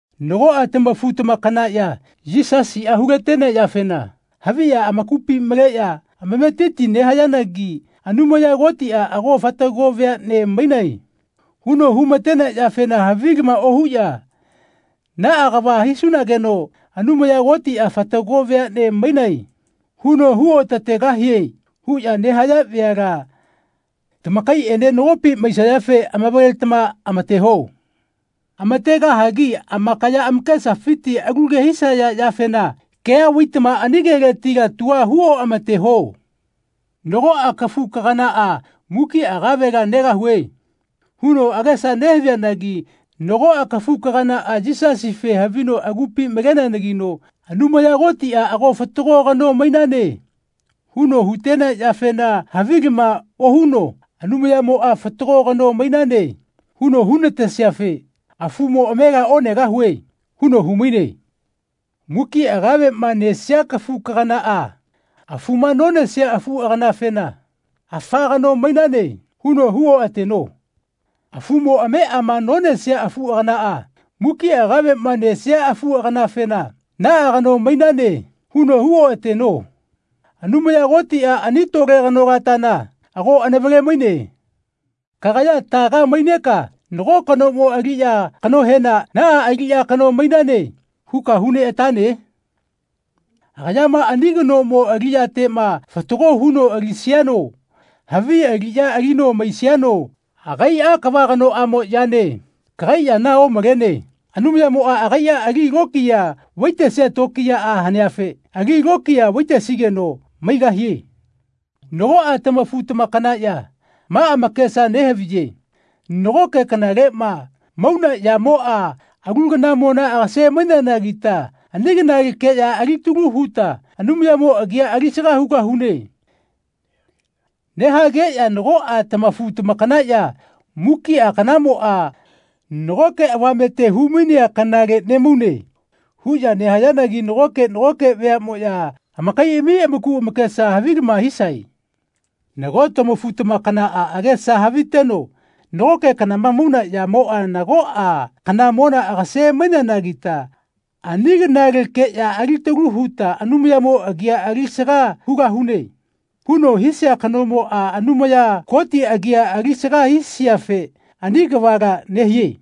Nagoꞌa tamafu-tamakanaꞌya Yisasiꞌa hulatenea yafena haviꞌya amakupi maleꞌya amametiti nehayanagi Anumaya Kotiꞌa “Ago fatago veaꞌne mainae.” huno humatenea yafena havilama ohuꞌya “Naꞌa kava hisunageno Anumaya Kotiꞌa ‘Fatago veaꞌne mainae.’ huno huotategahie.” huꞌya nehaya veala tamakaiꞌene nagopi maisayafe amavaletama amateho. Amategahagi amakaya amakesafiti alu ke hisaya yafena kea vaitama ani keletila tua hu omateho. Nagoꞌa kafu-kaganaꞌa “Mukiꞌa kavela negahue.” huno agesa nehavianagi nagoꞌa kafu-kaganaꞌa Yisasife havino agupi maleneanagino Anumaya Kotiꞌa “Ago fatago kano mainane.” huno hutenea yafena havilama ohuno “Anumayamoꞌa fatago kano mainane huno hunatesiafe afumo amela onegahue.” huno humaine. Mukiꞌa kaveꞌma nesia kafu-kaganaꞌa afuma nonesia afu-agananafena “Afa kano mainane.” huno huoꞌateno. Afumo ameꞌama nonesia afu-aganaꞌa mukiꞌa kaveꞌma nesia afu-aganafena “Naꞌa kano mainane.” huno huoꞌateno. Anumaya Kotiꞌa ani tole kanolatana ago anavale-maine. Kagaya taga maineka nago kanomo aliꞌya kanohena “Naꞌa aliꞌya kano mainane.” huka huneꞌatane? Agayama ani kanomo aliꞌyateꞌma fatago huno alisiano havi aliꞌya alino maisiano agaiꞌa kava kanoꞌamo yane. Kagai yana omalene. Anumayamoꞌa agaiꞌa ali lokiya vaitesia tokiyaꞌa haneafe ali lokiya vaitesigeno maigahie. Nagoꞌa tamafu-tamakanaꞌya ma amakesa nehaviye “Nagoke kanaleꞌma mauna yamoꞌa alu kanamona agase-maineanagita ani kanalekeꞌya alitalu huta Anumayamo agia alisaga hugahune.” nehageꞌya nagoꞌa tamafu-tamakanaꞌya “Mukiꞌa kanamoꞌa nagoke avamete humainea kanale nemaune.” huꞌya nehayanagi nagoke nagoke veaꞌmoꞌya amakaiꞌami amaku amakesa havilama hisae. Nago tamafu-tamakanaꞌa agesa haviteno “Nagoke kanama mauna yamoꞌa nagoꞌa kanamona agase-maineanagita ani kanalekeꞌya alitalu huta Anumayamo agia alisaga hugahune.” huno hisia kanomoꞌa Anumaya Koti agia alisaga hisiafe ani kavala nehie.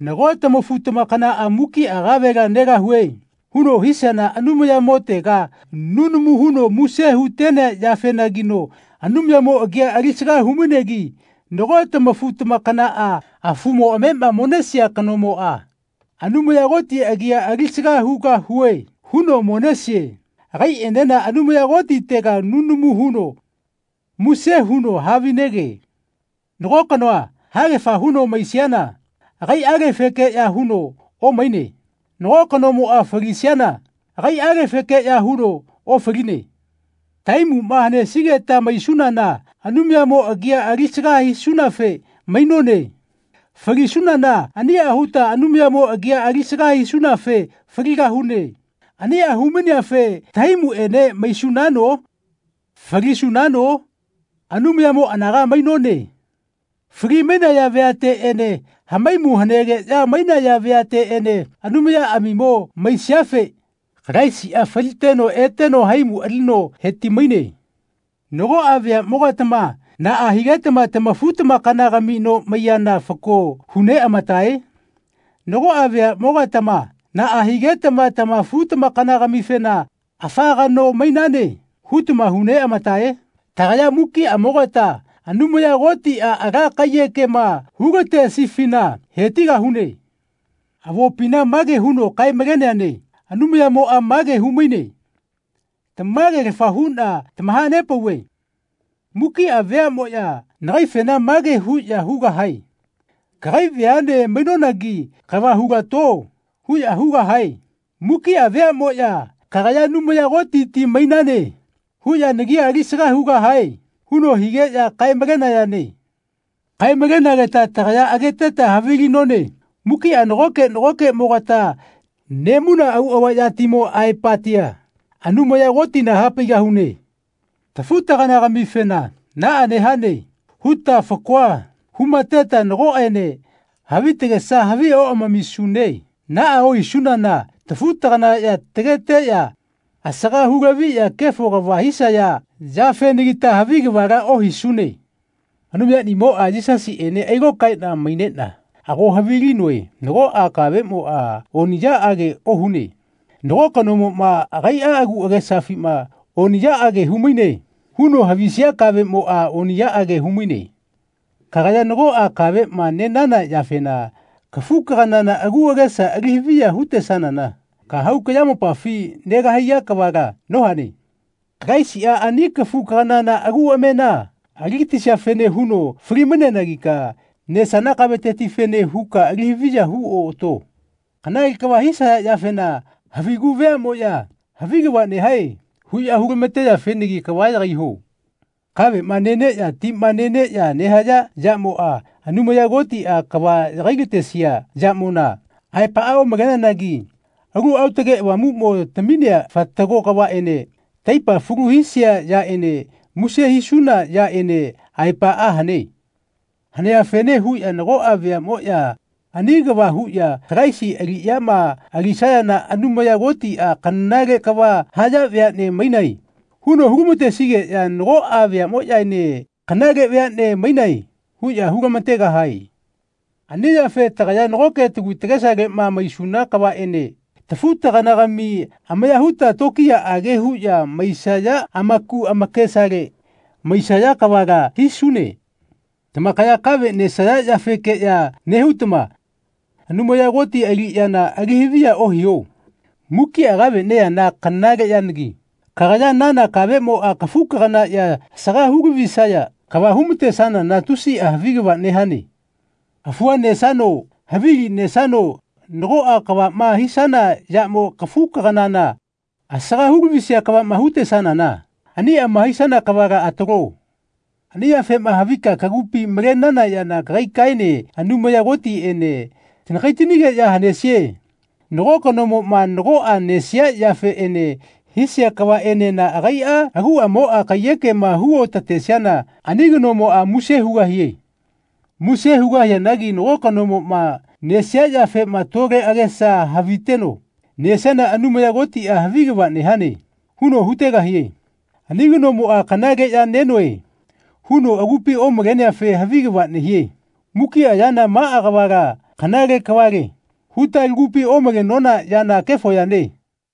Nago tamafu-tamakanaꞌa “Mukiꞌa kavela negahue.” huno hisiana Anumayamotega nunamu huno muse hutenea yafenagino Anumayamo agia alisaga humainegi nago tamafu-tamakanaꞌa afumo ameꞌma monesia kanomoꞌa “Anumaya Koti agia alisaga hugahue.” huno monesie. Agaiꞌenena Anumaya Kotitega nunamu huno muse huno havinege. Nago kanoa haegafa huno maisiana agaiꞌalefekeꞌya huno omaine. Nago kanoma falisiana agaiꞌalefekeꞌya huno ofaline. Tahaimuꞌma hanesigeta maisunana Anumayamo agia alisaga hisunafe mainone. Falisunana aniꞌa huta Anumayamo agi alisaga hisunafe faligahune. Aniꞌa humaineafe tahaimuꞌene maisunano falisunano Anumayamo anaga mainone. Fali-mainaya veateꞌene hamaimu hanegeꞌya mainaya veateꞌene Anumayaꞌamimo maisiafe Kalaisiꞌa faliteno eteno haimu alino heti-maine. Nagoꞌa veaꞌmogatama naꞌa higetama tamafu-tamakanagami no maiyana fako huneꞌamatae? Nagoꞌa veaꞌmogatama naꞌa higetama tamafu-tamakanafena “Afa kano mainane.” hutama huneꞌamatae? Tagaya mukiꞌamogata Anumaya Kotiꞌa ala kaiyekema hulatesifina hetigahune. Avopina mage huno kae-maleneane Anumayamoꞌa mage humaine “Tamagelafa huꞌna tamahanepauve mukiꞌa veaꞌmoꞌya nagaifena mage huꞌya hugahae ‘Kagai veaꞌne mainonagi kava hulato.’ huꞌya hugahae. Mukiꞌa veaꞌmoꞌya ‘Kagaya Anumaya Kotiti mainane.’ huꞌya nagia alisaga hugahae.” huno higeꞌya kae-malenayane. Kae-malenageta tagaya ageteta havilinone mukiꞌa nagoke nagokeꞌmogata nemauna auꞌava yatimo aepatia Anumaya Kotina hapaigahune. Tafu-taganagamifena “Naꞌa nehane.” huta fakoa humateta nagoꞌene havi tagesa havi oꞌamamisune. Naꞌa ohisunana tafu-taganaꞌya tageteꞌya asaga hulaviꞌya kefo kava hisaya yafenagita havi kavala ohisune. Anumayanimoꞌa Yisasiꞌene ailokaeꞌna maineꞌna ago havilinoe nagoꞌa kaveꞌmoꞌa oniꞌyaꞌage ohune. Nago kanomoꞌma agaiꞌa agu agesafima “Oniꞌyaꞌage humaine.” huno havisia kaveꞌmoꞌa oniꞌyaꞌage haumaine. Kagaya nagoꞌa kaveꞌma nenana yafena kafu-kaganana agu agesa alihaviya hutesanana kahau kayamopafi negahaiya kavala nohane. Kalaisiꞌa ani kafu-kaganana agu amena aligatisiafene huno fali-maineanagika nesana kavetetifene huka alihaviya huoꞌato. Kanale kava hisaya yafena havigu veaꞌmoꞌya “Havi kava nehae.” huꞌya hulamateyafenagi kava yagaiho. Kaveꞌma neneꞌya tima neneꞌya nehaya yamoꞌa Anumaya Kotiꞌa kava yagailatesia yamona aepaꞌa omaleneanagi Alu Aotage Avamuꞌmo taminea fatago kavaꞌene taipa falu hisia yaꞌene muse hisuna yaꞌene aepaꞌa hane. Haneafene huꞌya nagoꞌa veaꞌmoꞌya ani kava huꞌya Kalaisi aliꞌyama alisayana Anumaya Kotiꞌa “Kanale kava haya veaꞌne mainae.” huno hulamatesigeꞌya nagoꞌa veaꞌmoꞌyaene “Kanale veaꞌne mainae.” huꞌya hulamategahae. Ani yafe tagaya nagoke tagu tagesaleꞌma maisuna kavaꞌene tafu-taganagami amaya huta tokiyaꞌage huꞌya maisaya amaku amakesale maisaya kavala hisune. Tamakaya kave nesaya yafekeꞌya nehutama Anumaya Koti aliꞌyana alihaviya ohiho. Mukiꞌa kave neyana kanale yanagi kagaya nana kavemoꞌa kafu-kaganaꞌya asaga hulavisaya kava humatesanana tusiꞌa havi kava nehane. Afua nesano havilima nesano nagoꞌa kavaꞌma hisana yamo kafu-kaganana asaga hulavisia kavaꞌma hutesanana aniꞌama hisana kavala atalo. Ani yafema havika kagupi malenana yana kagaikaene Anumaya Kotiꞌene tanakaitanigeꞌya hanesie. Nago kanomoꞌma nagoꞌa nesia yafeꞌene hisia kavaꞌenena agaiꞌa aguꞌamoꞌa kaiyekema huoꞌatesiana ani kanomoꞌa muse hugahie. Muse hugahianagi nago kanomoꞌma nesia yafema tole agesa haviteno nesiana Anumaya Kotiꞌa “Havi kava nehane.” huno hutegahie. Ani kanomoꞌa “Kanale ya nenoe.” huno agupi omaleneafe havi kava nehie. Mukiꞌa yana “Maꞌa kavala kanale kavale.” huta lagupi omalenona yana kefo yane.